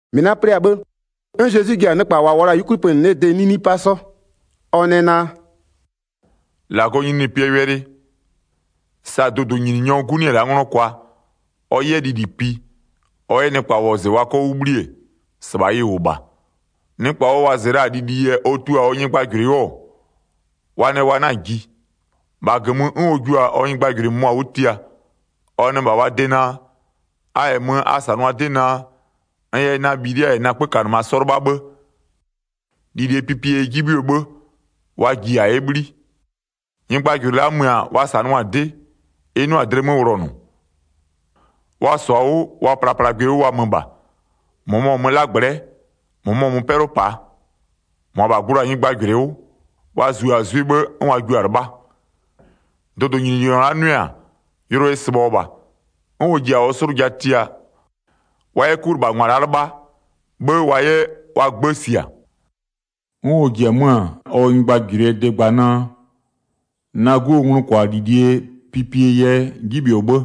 1-Mɩ la'a plɩ-a 'bhë, 'n Zezwi ji-a nɩkpa -wa -wʋɔ la-a 'yukwli pönɩ 'lee de 'nini 'pa 'sɔ. Ɔ nɛ naa: “-Lagɔɔ nyininyinipɩɛ wɛlɩ, sa dʋdʋnyininyɔɔ 'gu 'nɩ-ɛ la'a 'nglɔ kwa, ɔ 'yɛ lili pi, ɔ 'yɛ nɩkpa wɔzɩ wa 'kɔ 'wʋ 'bhli-e, -sɩbha ɩ -wʋ -bha. Nɩkpa ɔ wɔzɩ la-a lili yɛ ɔ tua-a ɔ nyɩgbajʋlʋɩ 'wʋ-ɔ, wa nɛ wa 'na-a ji. 4-Bha -gömö, 'n ɔ jua-a ɔ nyɩgbajʋlʋɩ -mʋmʋa 'wʋ tia. Ɔ nɛ -bha wa de naa: A -yɛ mö a -sanʋa 'dɩ naa, n yɛ na bhilia -yɛ na 'kpökanɩma 'sɔ 'lɩbha 'bhë, lilie pipie yɛ 'ji 'bhɩɔ 'bhë, wa ji -a 'yɛ 'bhli. Nyɩgbajʋlʋɩ la'a mö-a, wa -sanʋa-a -sɩbha 'dɩ, ɩ 'nʋa-a dlɩ 'mö wlɔnʋ. Wa -sɔ-a 'wʋ, wa plaplagbɩ 'wʋ wa mö -bha. -Mʋmɔ mö ɔ 'lagblɛ'ɛ, -mʋmɔ mö 'pɛlʋ -paa. 6-Mʋabha gblo-a nyɩgbajʋlʋɩ 'wʋ, wa zua-a 'zwɩ 'bhë, 'n wa jua-a 'lɩbha. Dʋdʋnyininyɔ la'a 'nʋɩ-a, yʋlʋ ɩ sɩbhɔ-ɔ -bha, 'n ɔ ji-a ɔ 'slʋja tia, wa 'yɛ 'kulɩbhangwa la'a 'lɩbha, 'bhë wa 'yɛ wa 'gbë sia. 'N ɔ ji-e 'mö-a ɔ nyɩgbajʋlʋɩɛ de gba naa: Na 'guo nglʋkwalilie pipie yɛ 'ji 'bhɩɔ 'bhë,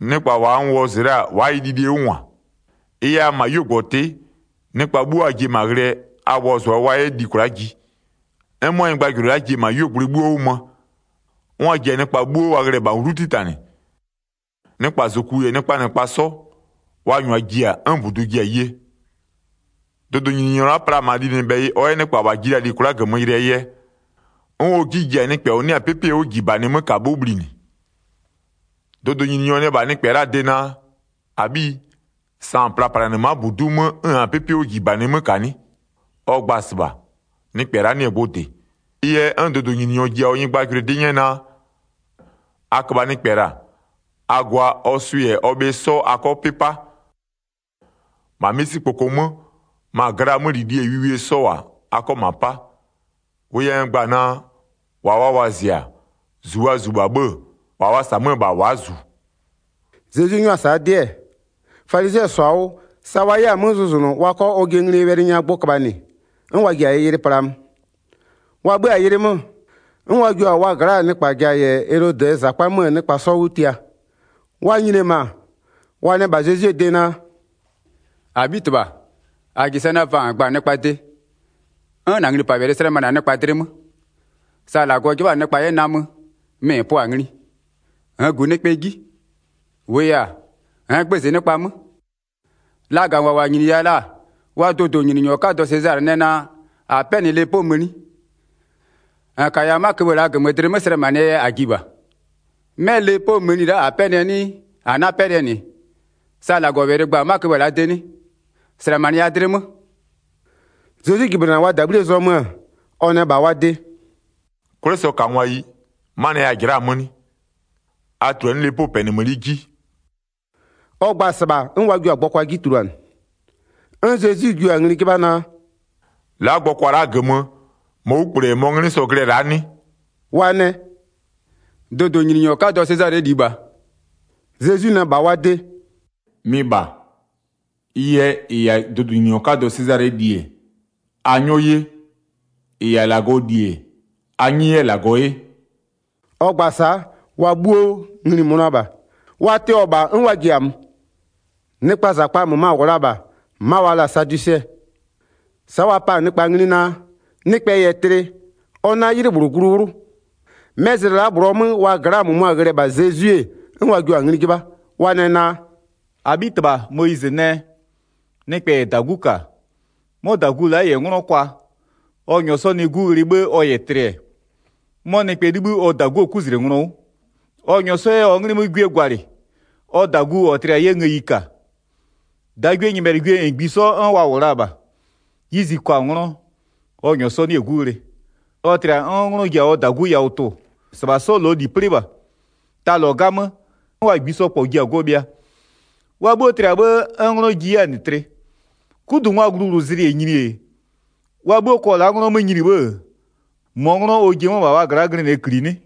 nɩkpa n wɔzɩ la-a wa'a ɩ lilie 'wʋ -ngwa. Ɩ yɛ a mö -ma 'yuogbɔtɩ'ɩ, nɩkpa 'bhuo a ji-e -ma ghlɩɛ, a wɔzʋa wa 'yɛ li kwla'a ji. 'N 'mʋa nyɩgbajʋlʋɩ la'a ji-e -ma 'yuogblʋɩ 'bhuo 'wʋ mö, 'n wa ji-a nɩkpa 'bhuo wa ghlɩ-ɛ -ma 'wlu 'titanɩ, nɩkpa -zoku -yɛ nɩkpaa -nɩkpa 'sɔ, wa -nyʋa ji-a, 'n -budu ji-a ye. Dʋdʋnyininyɔ la'a pla-a -ma linɩbhɛyɩ ɔ 'yɛ nɩkpa -wa ji-a li kwla'a -gömö yɩlɩɛ yɛ, 'n ɔ 'ji ji-a nɩkpɛ -ɔ 'nɩ-a 'pɩpɩɛ 'wʋjibanɩ 'mö -ka 'wʋ bhlinɩ. Dʋdʋnyininyɔ nɛ -bha nɩkpɛ la'aa de naa: -Abhiyi, sa -n plaplanɩ-ɛ ma'a -budu'u 'mö 'n -nn-a 'pɩpɩɛ 'wʋjibanɩ 'mö -ka 'nɩ? Ɔ gba-a -sɩbha, nɩkpɛ la'a 'nɩ-ɛ gbʋ -dɩ. Ɩ yɛ 'n dʋdʋnyininyɔ ji-a ɔ nyɩgbajʋlʋɩ 'dɩ 'nyɛ naa: A köbha nɩkpɛ -la, a gwa ɔ swɩ -yɛ ɔ bhɩ 'sɔ a 'kɔ 'pɩ 'pa. -Ma 'misikpoko 'mö, ma glaa 'mölilie -yɛ wiwie 'sɔ -wʋ-a, a 'kɔ -ma 'pa. Wʋ yɛ n gba-a naa: -Wa wa wɔzɩ-a, -zu wa zu-a 'bhë-ë, -wa wa -sa 'mö-ö -bha wa'a -zu.” Zezwi 'nyʋa-a sa'a 'dɩ-ɛ, falizɩɛ -sɔ-a 'wʋ, sa wa 'yɛ-a 'mö zʋzʋnʋ, wa 'kɔ ɔjɩɛ nglie wɛlɩ nya gbʋ köbhanɩ, 'n wa ji-a ɩ yɩlɩ plaa mö. Wa 'bhö-a yɩlɩ 'mö, 'n wa jio-a wa 'wʋbhlinɩngwa gla'aa nɩkpa ja -yɛ Elodɩɛ -zakpa 'möö nɩkpa 'sɔ 'wʋ tia. Wa nyini-e -ma, wa nɛ -bha Zezwie de naa: “-Abhitɩbha, -a -ji sɛ naa vaa -n gba-a nɩkpaa de, 'n -na nglipalɩ slɛmanɩ-a nɩkpa dlɩ 'mö. Sa -Lagɔ 'jɩbha-a nɩkpa 'yɛ namö mɩ -n pʋa-a ngli, -nn -gu nɩkpaa 'ji, -wʋʋ yɛ-a, -nn gbëzɩ nɩkpa 'mö. Lagangwa -wa -nyiniya-a la'a wa dʋdʋnyininyɔ 'kadɔ Sezalɩ nɛ naa, -a 'pɛnɩ lepoo mëni, -n -kaya 'ma köbhë la'a -gömö dlɩ 'mö slɛmanɩɛ yɛ -a ji -bha. 'Mɛ lepoo mëni la'a -a 'pɛnɩɛ 'nɩɩ, -aa 'pɛnɩɛ -nɩ? Sa -Lagɔwɛlɩ gba-a 'ma köbhë la'aa de 'nɩ? -Slɛmanɩya dlɩ 'mö.” Zezwi jɩblɩnɩ-a wa -dabhlie zɔmö-ö, ɔ nɛ -bha wa de: “'Kwlɩsɔkangwayi, 'manɩɛ yɛ a -jɩla'a-a 'mö 'nɩ? A -tuluanɩ'ɩ 'lepoo 'pɛnɩmëni 'ji,” ɔ gba-a -sɩbha 'n wa jio-a gbɔkwa 'ji tuluanɩ. 'N Zezwi jua-a ngli 'jɩbha naa: “La'a gbɔkwa la'a -gömö, -mɔɔ 'wlukple -yɛ -mɔɔ 'nglɩ sɔ-ɔ glɩ-ɛ la'a 'nɩ?” Wa nɛ: “Dʋdʋnyininyɔ 'kadɔ Sezalɩɛ -li -bha.” Zezwi nɛ -bha wa de: “Mɩ -bha. Ɩ yɛ, -ɩ -yɛ-a dʋdʋnyininyɔ 'kadɔ Sezalɩɛ -li-e, a 'nyɔ 'ye, -ɩ -yɛ-a -Lagɔɔ -li-e, a 'nyɩ 'yɛ -Lagɔ 'ye.” Ɔ gba-a sa'a, wa 'bhuo ngli-i mönʋa -bha. Wa tɩɔ-ɔ -bha 'n wa ji-a mö. Nɩkpaa -zakpa -möma -wʋ la-a -bha, 'ma wa la-a sadwisɩɛ. Sa'a wa pa-a nɩkpa ngli naa: Nɩkpɛ -yɛ tlɩ, ɔ 'na 'ylɩ -bhlʋ glu 'wlʋ. 'Mɛ zlɩ la'a -bhlʋɔ 'mö wa gla'aa -mʋmʋa ghlɩ-ɛ -bha Zezwi-e, 'n wa jio-a ngli 'jɩbha. Wa nɛ naa: “-Abhitɩbha, Moyizɩ nɛ: Nɩkpɛ -yɛ -dagu -ka, 'mɔ -dagu la'a -yɛ 'nglɔ kwa, ɔ -nyɔɔ 'sɔ nɩ 'gu ghlɩ 'bhë ɔ -yɛ tlɩ-ɛ, 'mɔ nɩkpɛ 'libhï ɔ -daguo 'kuzlenglɔ 'wʋ, ɔ -nyɔɔ 'sɔ 'yɛ ɔ 'nglɩ 'mö 'gwie gwalɩ, ɔ -dagu -ɔ tlɩ-a 'yɛ ngëyi -ka. 25-Dagwienyɩbhɛlɩgwie -ngbisɔ 'n wa -wʋ la-a -bha. 'Yizi kwa-a 'nglɔ, ɔ -nyɔɔ 'sɔ 'nɩ-ɛ 'gu ghlɩ, ɔ tlɩ-a 'n 'nglɔ ji-a ɔ -dagu yawʋ tʋ-ʋ. 26-Sɩbha 'sɔ -lɔɔ -li 'plɩ -bha, ta -lɔ 'gamö, 'n wa -ngbisɔ -kpɔ ji-a go bhɩa. Wa 'bhuo tlɩ-a 'bhë, 'n 'nglɔ ji 'yɛ-a -nɩ tlɩ. 'Kudungwaa gluwlʋzlɩ -yɛ nyini-e, wa 'bhuo kɔ la'a 'nglɔ 'mö nyini 'bhë-ë, -mɔɔ 'nglɔ ɔ ji-e 'mö-ö -bha wa gla'a glɩnɩɛ -kli 'nɩ?”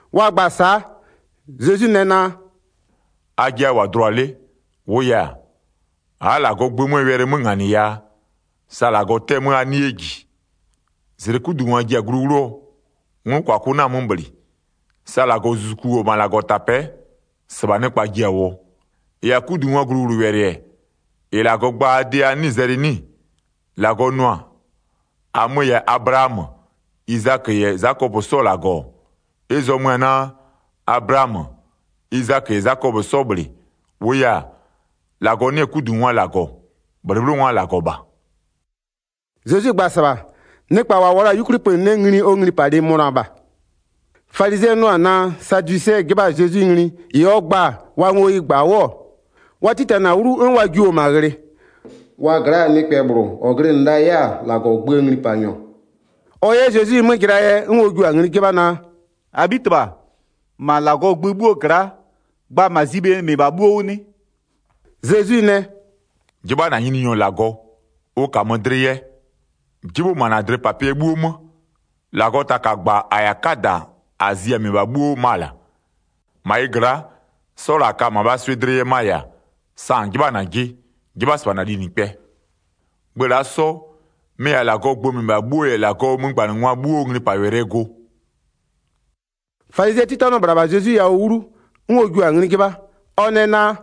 Wa gba-a sa'a, Zezwi nɛ naa: “Ajɩ a -wʋ-a dlʋa 'le, -wʋʋ yɛ-a, a'a -Lagɔbɔgʋ 'möö wɛlɩ 'mö -nganɩ yaa, sa -Lagɔ 'tɛ-ɛ 'mö a 'nɩ 'yɛ -ji. 30-Zlɩ 'kudungwa ji-a glu 'wlʋɔ, nglʋkwakʋ 'na-a 'mö -bhlɩ. Sa -Lagɔzuzuku -wʋ-ɔ -ma -Lagɔtapɛ'ɛ, -sɩbha nɩkpa ji-a -wʋɔ. 31-Ɩ -yɛ-a 'kudungwaa gluwlʋwɛlɩ-ɛ, -ɩ -Lagɔ gba-a a de a 'nɩɩ-ɩ zɛlɩ 'nɩ-ɩ? 32-Lagɔ nʋ-a: -Amö-ö -yɛ-a Ablaamö, Izakö -yɛ Zakɔpö 'sɔɔ -Lagɔ-ɔ, ɩ zɔmö-ö naa, Ablamö, Izakö -yɛ Zakɔpö 'sɔ -bhlɩ. -Wʋʋ yɛ-a, -Lagɔ 'nɩ-ɛ 'kudungwaa -Lagɔ, -bhlɩbhlɩngwaa -Lagɔ -bha.” Zezwi gba-a -sɩbha, nɩkpa -wa -wʋɔ la-a 'yukwli pönɩ 'le ngli ɔ nglipalɩ mönʋa -bha. Falizɩɛ 'nʋ-ɔ naa sadwisɩɛ 'jɩbha-a Zezwi ngli -ɩ ɔ gba-a wa ngo ɩ -gba 'wʋ-ɔ, wa 'titanɩ-a 'wlu 'n wa jio-o -ma ghlɩ. Wa gla'aa nɩkpɛ -bhlʋ -ɔ glɩnɩ la 'yɛ-a -Lagɔɔ gböö nglipanyɔ, ɔ 'yɛ Zezwi 'mö jɩlaa yɛ, 'n ɔ jio-a ngli 'jɩbha naa: “-Abhitɩbha, -ma -Lagɔɔ gbö 'bhuo gla'a, gba -ma zi bhe -mɩbha 'bhuo 'wʋ 'nɩ?” Zezwi nɛ: “'Jɩbha -na Nyininyɔ -Lagɔ, ʋ -kamö dlɩ yɛ, 'jɩbhʋ -ma -na dlɩpapɩɛ 'bhuo 'mö. 38-Lagɔɔ taka -gba -a -yɛ-a 'kada -a zi-a -mɩbha 'bhuo 'wʋ ma-a -la. 39-Ma ɩ gla'a, 'sɔ -la -a ka-a -mabhaa swɩ dlɩ yɛ ma -yɛ-a: Sa -n 'jɩbha-a -najɩ, 'jɩbha -sɩbha -na linɩkpɛ. Gbö la'a 'sɔ, mɩ-ɩ -yɛ-a -Lagɔɔ gbö -mɩbha 'bhuo -yɛ -Lagɔɔ 'mögbanɩngwa 'bhuoo nglipawɛlɩɛ go.” Falizɩɛ 'titanɩɔ -bhla -bha Zezwi yawʋ 'wlu, 'n ɔ jua-a ngli 'jɩbha. Ɔ nɛ naa: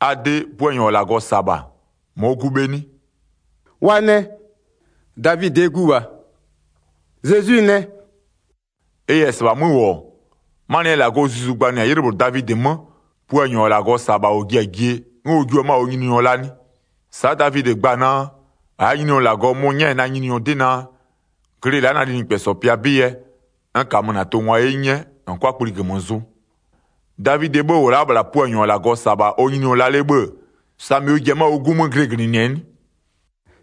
“A de, Puanyɔ -ɔ -Lagɔ -sa-a -bha, -mɔɔ gu bhe 'nɩ?” Wa nɛ: “Davidɩɛ gu -bha.” Zezwi nɛ: “Ɩ -yɛ -sɩbha 'mö -wʋ-ɔ, 'manɩɛ yɛ -Lagɔɔ Zuzu gbanɩ-a 'ylɩ -bhlʋ Davidɩ 'mö, Puanyɔ -ɔ -Lagɔ -sa-a -bha -ɔ ji-a jie 'n ɔ jio 'mö-a ɔ Nyininyɔ la 'nɩ? Sa'a Davidɩ gba-a naa: -Aa Nyininyɔ -Lagɔ mʋ-ʋ 'nyɛ-a na Nyininyɔ 'dɩ naa: Glɩ la'a na linɩkpɛsɔ pɩa 'bɩ yɛ, n -kamö -na tʋngwa 'ye 'nyɛ, -n 'kʋa kpli -gömö zʋ. Davidɩɛ 'bhë -wʋ la'a -bhla Puanyɔ -ɔ -Lagɔ -sa-a -bha ɔ Nyininyɔ la 'le 'bhë-ë, samɩ ɔ ji-e 'mö-a ɔ 'gu 'mö glɩglɩnɩ-ɛ 'nɩ?”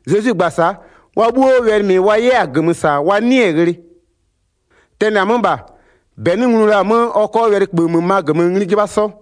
Zezwi gba-a sa'a, wa 'bhuo wɛlɩ -mɩ wa 'yɛ-a -gömö -sa wa 'nɩɩ-ɩ ghlɩ. Tɛnɩ-a 'mö -bha, -bɛ 'nɩ nglu la-a 'mö ɔ 'kɔ wɛlɩköbhë -möma -gömö ngli 'jɩbha 'sɔ.